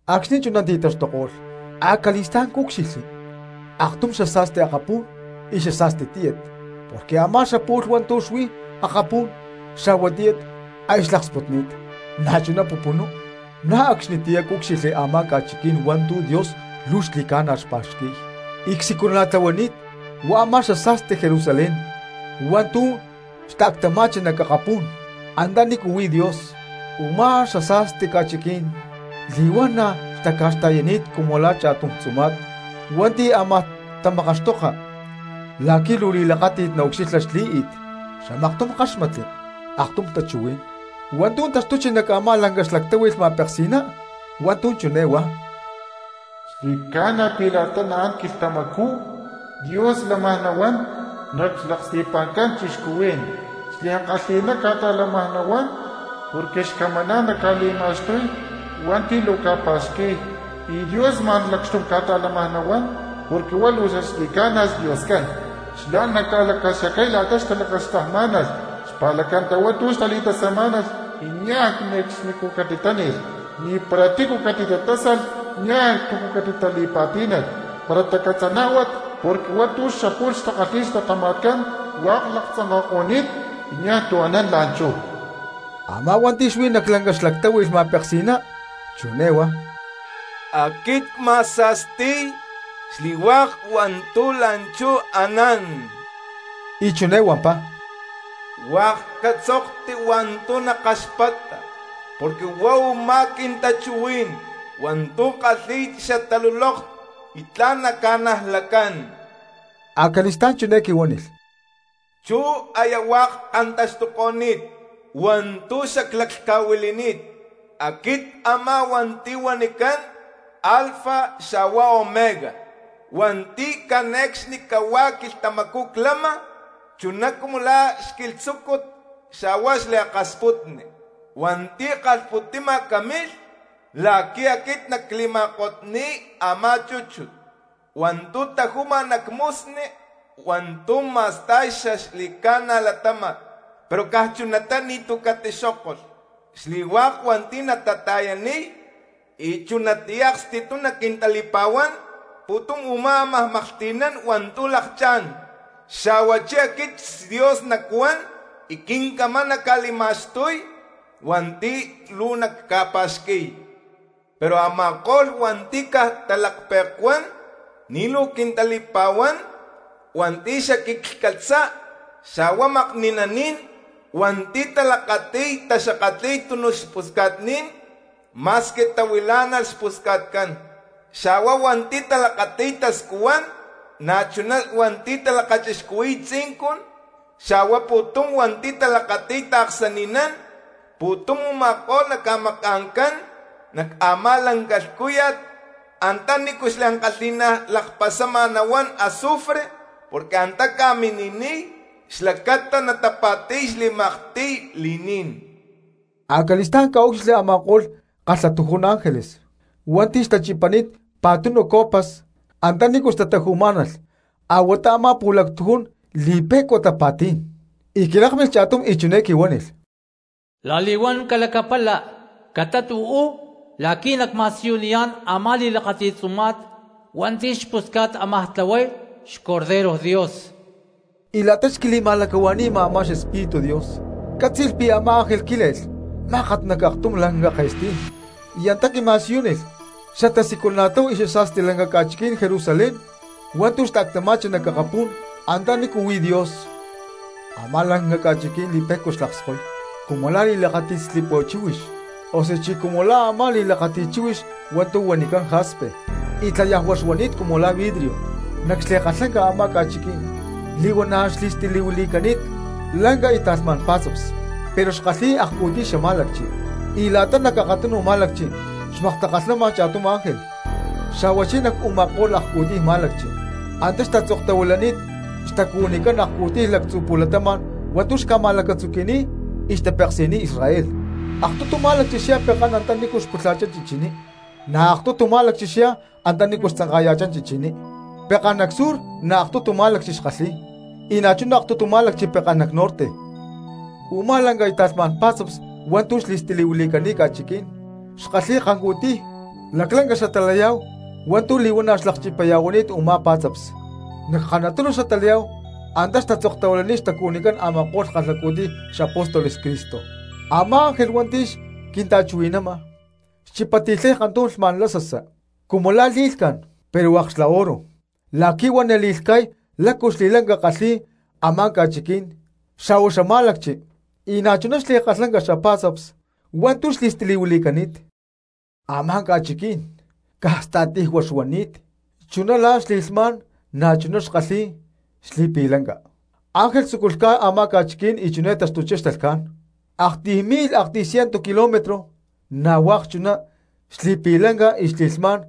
Acxni̠ chuná ti̠taxtuko̠lh, acali̠stá̠n cúcxilhli aktum xasa̠sti akapú̠n y xasa̠sti tíyat; porque a̠má xapu̠lh hua̠ntu̠ xuí akapú̠n xa̠hua tíyat aya xlaksputni̠t, na̠chuná pupunú. Na̠ acxnitiyá cúcxilhli a̠má ca̠chiquí̠n hua̠ntu̠ Dios luu xli̠ca̠na xpa̠xqui̠y y csiculana̠tlahuani̠t, huá a̠má xasa̠sti Jerusalén hua̠ntu̠ xta̠ctama̠chi nac akapú̠n antanícu huí Dios. Umá xasa̠sti ca̠chiquí̠n li̠huana̠ xtaca̠xta̠yani̠t cumu la̠ cha̠tum tzuma̠t hua̠nti̠ ámaj tamakaxtoka la̠qui̠ luu li̠lakáti̠t naucxilha xlí̠i̠t. Xamaktum ckáxmatli aktum tachuhuí̠n hua̠ntu̠ taxtuchi nac a̠má lanca xlactáhui̠lh ma̠peksi̠ná, hua̠ntu̠ chiné huá: —Xli̠ca̠na pi̠ la̠ta naán quilhtamacú Dios lamaj nahuán nac xlaksti̠pa̠ncán cristianos. Xliankalhi̠ná ca̠ta̠lámaj nahuán porque xcamaná̠n naca̠li̠ma̠xtuy hua̠nti̠ luu ca̠pa̠xqui̠y, y Dios ma̠n lacxtum ca̠ta̠lámaj nahuán porque huá luu xaxli̠ca̠na xDioscán. Xlá naca̠lacaxacay la̠ta xtalakaxtajmá̠nalh xpa̠lacata hua̠ntu̠ xtali̠tasamá̠nalh y niaj ne̠cxnicú catitáni̠lh, ni̠para tícu catitatásalh, niaj tu̠ catitali̠pa̠tí̠nalh, para tacatzanájuat, porque hua̠ntu̠ xapu̠lh xtakalhi̠y xlatama̠tcán y xanán aya hua̠k laktzanka̠ko̠ni̠t, y niaj tu̠ anán la̠nchú. Amá hua̠nti̠ xuí nac lanca xlactáhui̠lh ma̠peksi̠ná chiné huá: —¡Aquit cma̠sa̠sti̠y xli̠hua̠k hua̠ntu̠ la̠nchú anán! Y chiné huampá: —Hua̠k catzokti hua̠ntu̠ nakaxpata porque huá u̠má quintachuhuí̠n hua̠ntu̠ kalhi̠y xtalulóktat, y tla̠n ca̠najlacán. Acali̠stá̠n chiné quihuánilh: —Chú aya hua̠k kantaxtuko̠ni̠t hua̠ntu̠ xaclaclhca̠huili̠ni̠t. Aquit a̠má hua̠nti̠ huanicán Alfa xa̠hua Omega, hua̠nti̠ cane̠cxnicahuá quilhtamacú clama, chuná cumu la̠ xquilhtzúcut xa̠hua xliakasputni. Hua̠nti̠ kalhpu̠ti̠ma camilh la̠qui̠ aquit nacli̠ma̠kotni̠y a̠má chúchut hua̠ntu̠ tajúma nac musnu hua̠ntu̠ ma̠sta̠y xaxli̠ca̠na latáma̠t, pero caj chunatá ni̠tu̠ catixókolh. Xli̠hua̠k hua̠nti̠ natata̠yaniy y chunatiyá aksti̠tum naquintali̠pa̠huán, pu̠tum u̠má ámaj maklhti̠nán hua̠ntu̠ lakchá̠n, xa̠huachí aquit xDios nacuán y quincamán nacca̠li̠ma̠xtuy hua̠nti̠ luu nacca̠pa̠xqui̠y. Pero a̠ma̠ko̠lh hua̠nti̠ caj talaklhpe̠cuán ni̠ luu quintali̠pa̠huán, hua̠nti̠ xaquiclhcatza, xa̠hua makni̠naní̠n, hua̠nti̠ talakati̠y taxakatli̠y tunuj lacpusca̠tní̠n ma̠squi tahuilá̠nalh xpusca̠tcán, xa̠hua hua̠nti̠ talakati̠y tascuhuán, na̠chuná hua̠nti̠ talakachixcuhui̠y tzincun xa̠hua pu̠tum hua̠nti̠ talakati̠y taaksani̠nán, pu̠tum u̠ma̠ko̠lh naca̠maca̠ncán nac a̠má lanca lhcúya̠t antá nícu xliankalhi̠ná lakpasama nahuán azufre, porque antá ca̠mini̠niy xlacata natapa̠ti̠y xli̠maktiy li̠ní̠n. Acali̠stá̠n cca̠úcxilhli a̠ma̠ko̠lh kalhatujún ángeles hua̠nti̠ xtachipani̠t pa̠tunu copas antanícu xtataju̠má̠nalh a̠huatá a̠má pu̠lactujún li̠pe̠cua tapa̠tí̠n, y quilákmilh cha̠tum y chiné quihuánilh: —La̠li̠huán calacapala catát uú la̠qui̠ nacma̠siyuniyá̠n a̠má li̠lakáti̠t tzuma̠t hua̠nti̠ xpusca̠t ámaj tlahuay xborrego Dios. Y la̠ta xquima̠lacahua̠ni̠ma a̠má xEspíritu Dios, ccátzi̠lh pi̠ a̠má ángel quíle̠lh mákat nac aktum lanca ke̠stí̠n, y antá quima̠siyúnilh xatasiculana̠tláhu y xasa̠sti lanca ca̠chiquí̠n Jerusalén hua̠ntu̠ xta̠ctama̠chi nac akapú̠n antanícu huí Dios. Amá lanca ca̠chiquí̠n li̠pe̠cua xlakskoy cumu la̠ li̠lakáti̠t slipua chíhuix, osuchí cumu la̠ a̠má li̠lakáti̠t chíhuix hua̠ntu̠ huanicán jaspe, y tlayajua xuani̠t cumu la̠ vidrio. Nac xli̠kalhlanca a̠má ca̠chiquí̠n li̠huana̠ xli̠stilihuili̠cani̠t lanca y ta̠lhmá̠n pá̠tzaps, pero xkalhi̠y akcu̠tiy xamá̠lacchi, y la̠ta nac akatunu má̠lacchi xmaktakalhnama cha̠tum ángel, xa̠huachí nac u̠ma̠ko̠lh akcu̠tiy má̠lacchi antá xtatzoktahuilani̠t xtacuhuinicán akcu̠tiy lactzú pu̠latama̠n hua̠ntu̠ xca̠ma̠lacatzuqui̠ni̠t y xtapeksi̠niy Israel. Aktutu má̠lacchi xyá pekán antanícu pu̠lha̠chá chichiní, na̠ aktutu má̠lacchi xyá antanícu tzanka̠ya̠chá chichiní, pekán nac sur na̠ aktutu má̠lacchi xkalhíy y na̠chuná aktutu má̠lacchi pekán nac norte. Umá lanca y ta̠lhmá̠n pá̠tzaps hua̠ntu̠ xli̠stilihuili̠cani̠t ca̠chiquí̠n xkalhi̠y kancu̠tiy laclanca xatalayá̠hu hua̠ntu̠ li̠huana̠ xlakchipaya̠huani̠t u̠má pá̠tzaps, nac kanatunu xatalayá̠hu antá xtatzokni̠t xtacuhuinicán a̠ma̠ko̠lh kalhacu̠tiy xapóstoles Cristo. Amá ángel hua̠nti̠ xquinta̠chuhui̠nama xchipati̠lhay kantum lhma̠n lasasa cumu la̠ li̠lhca̠n pero hua̠k xla oro, la̠qui̠ huá nali̠lhca̠y lácu xli̠lanca kalhi̠y a̠má ca̠chiquí̠n xa̠hua xamá̠lacchi, y na̠chuná xli̠kalhlanca xapa̠tzaps hua̠ntu̠ li̠stilihuili̠cani̠t. Amá ca̠chiquí̠n caj sta̠tijua xuani̠t; chuná la̠ xli̠lhmá̠n na̠chuná xkalhi̠y xli̠pi̠lanca. Angel tzúculh lhca̠y a̠má ca̠chiquí̠n y chiné taxtuchá xtalhcá̠n: aktiy mi̠lh aktiy cientu kilómetros; na̠ hua̠k chuná xli̠pi̠lanca, xli̠lhmá̠n,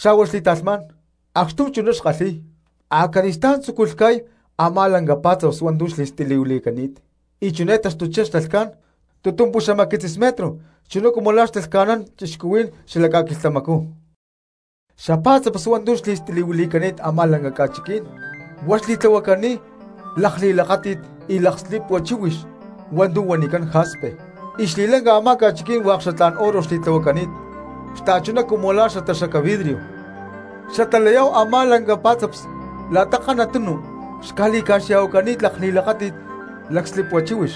xa̠hua xli̠ta̠lhmá̠n, acxtum chuná xkalhi̠y. Acali̠stá̠n tzúculh lhca̠y a̠má lanca xapá̠tzaps hua̠ntu̠ xli̠stilihuili̠cani̠t; y chiné taxtuchá xtalhcá̠n: tutumpuxamaquitzis metro, chuná cumu la̠ talhca̠nán cristianos xalac ca̠quilhtamacú. Xapá̠tzaps hua̠ntu̠ xli̠stilihuili̠cani̠t a̠má lanca ca̠chiquí̠n, huá xli̠tlahuacani̠t lakli̠lakáti̠t lacslipua chíhuix hua̠ntu̠ huanicán jaspe, y xli̠lanca a̠má ca̠chiquí̠n hua̠k xatlá̠n oro xli̠tlahuacani̠t, xta̠chuná cumu la̠ la̠n xataxaca vidrio. Xatalayá̠hu a̠má lanca pá̠tzaps la̠ta kanatunu xca̠li̠ca̠xya̠huacani̠t lakli̠lakáti̠t lacslipua chíhuix,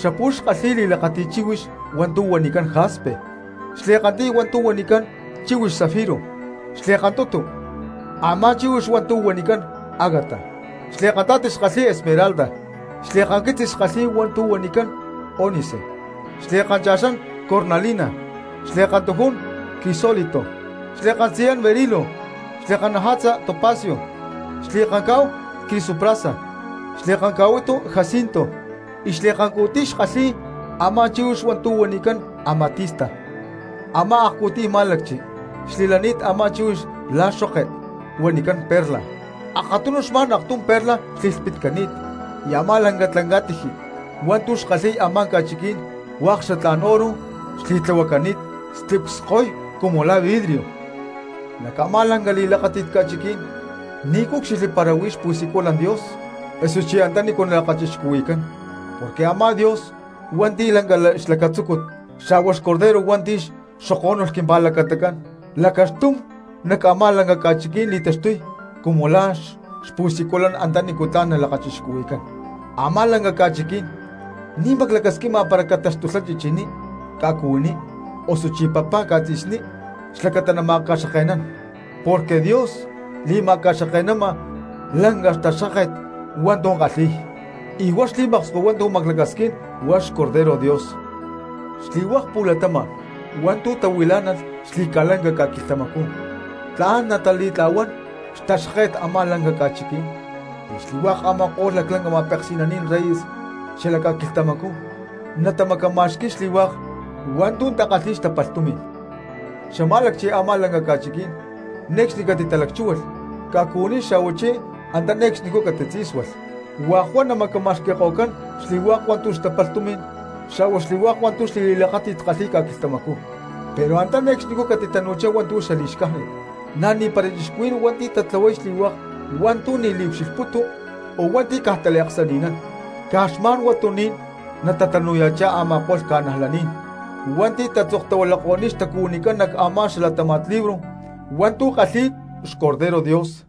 xapu̠lh xkalhi̠y li̠lakáti̠t chíhuix hua̠ntu̠ huanicán jaspe, xli̠kantiy hua̠ntu̠ huanicán chíhuix zafiro, xli̠kantutu a̠má chíhuix hua̠ntu̠ huanicán agata, xli̠kanta̠ti xkalhíy esmeralda; xli̠kanquitzis xkalhi̠y hua̠ntu̠ huanicán ónice; xli̠kancha̠xán cornalina; xli̠kantujún crisólito; xli̠kantzayán berilo; xli̠kannaja̠tza topacio; xli̠kancá̠hu crisoprasa; xli̠kanca̠huitu jacinto y xli̠kancu̠tiy xkalhi̠y a̠má chíhuix hua̠ntu̠ huanicán amatista. Amá akcu̠tiy má̠lacchi xli̠lani̠t amá chíhuix la̠ xoke huanicán perla, akatunu xma̠n aktum perla xli̠lhpitcani̠t. Y amá lanca tlanca̠tiji hua̠ntu̠ xkalhi̠y a̠má ca̠chiquí̠n hua̠k xatlá̠n oro xli̠tlahuacani̠t slip cskoy cumu la̠ vidrio. Nac a̠má lanca li̠lakáti̠t ca̠chiquí̠n ni̠ cúcxilhli para huí xpu̠siculán Dios osuchí antanícu nalakachixcuhui̠cán, porque a̠má Dios hua̠nti̠ lanca xlacatzúcut, xa̠hua xBorrego hua̠nti̠ xokó̠nulh quimpa̠lacatacán lacaxtum nac a̠má lanca ca̠chiquí̠n li̠taxtuy cumu la̠ xpu̠siculán antanícu tla̠n lakachixcuhui̠cán. Amá lanca ca̠chiquí̠n ni̠ maclacasquima para cataxtulhá chichiní ca̠cuhuiní, osuchí papá ca̠tzi̠sní xlacata nama̠xkake̠nán, porque Dios li̠macaxkake̠nama lanca xtaxkáket hua̠ntu̠ kalhi̠y, y huá xli̠maksko hua̠ntu̠ maclacasquín huá li̠taxtuy xBorrego Dios. Xli̠hua̠k cristianos hua̠nti̠ tahuilá̠nalh xli̠ca̠lanca ca̠quilhtamacú tla̠n natali̠tla̠huán xtaxkáke̠t a̠má lanca ca̠chiquí̠n, y xli̠hua̠k a̠ma̠ko̠lh laclanca ma̠peksi̠naní̠n reyes xalac ca̠quilhtamacú natamacama̠xqui̠y xli̠hua̠k hua̠ntu̠ takalhi̠y xtapalh tumi̠n. Xamá̠lacchi a̠má lanca ca̠chiquí̠n ne̠cxni catitalacchúhualh ca̠cuhuiní xa̠huachí antá ne̠cxnicú catitzí̠sualh. Hua̠k huá namacama̠xqui̠ko̠cán xli̠hua̠k hua̠ntu̠ xtapalh tumi̠n xa̠hua xli̠hua̠k hua̠ntu̠ xli̠li̠lakáti̠t kalhi̠y ca̠quilhtamacú. Pero antá ne̠cxnicú catitanu̠chá hua̠ntu̠ li̠xcájnit, na̠ ni̠para cristianos hua̠nti̠ tatlahuay xli̠hua̠k hua̠ntu̠ ni̠ liucxilhputu o hua̠nti̠ caj taliaksani̠nán. Caj xma̠n huatuní̠n natatanu̠ya̠chá a̠ma̠ko̠lh cristianos hua̠nti̠ tatzoktahuilako̠ni̠t xtacuhuinicán nac a̠má xalatáma̠t libro hua̠ntu̠ kalhi̠y xBorrego Dios.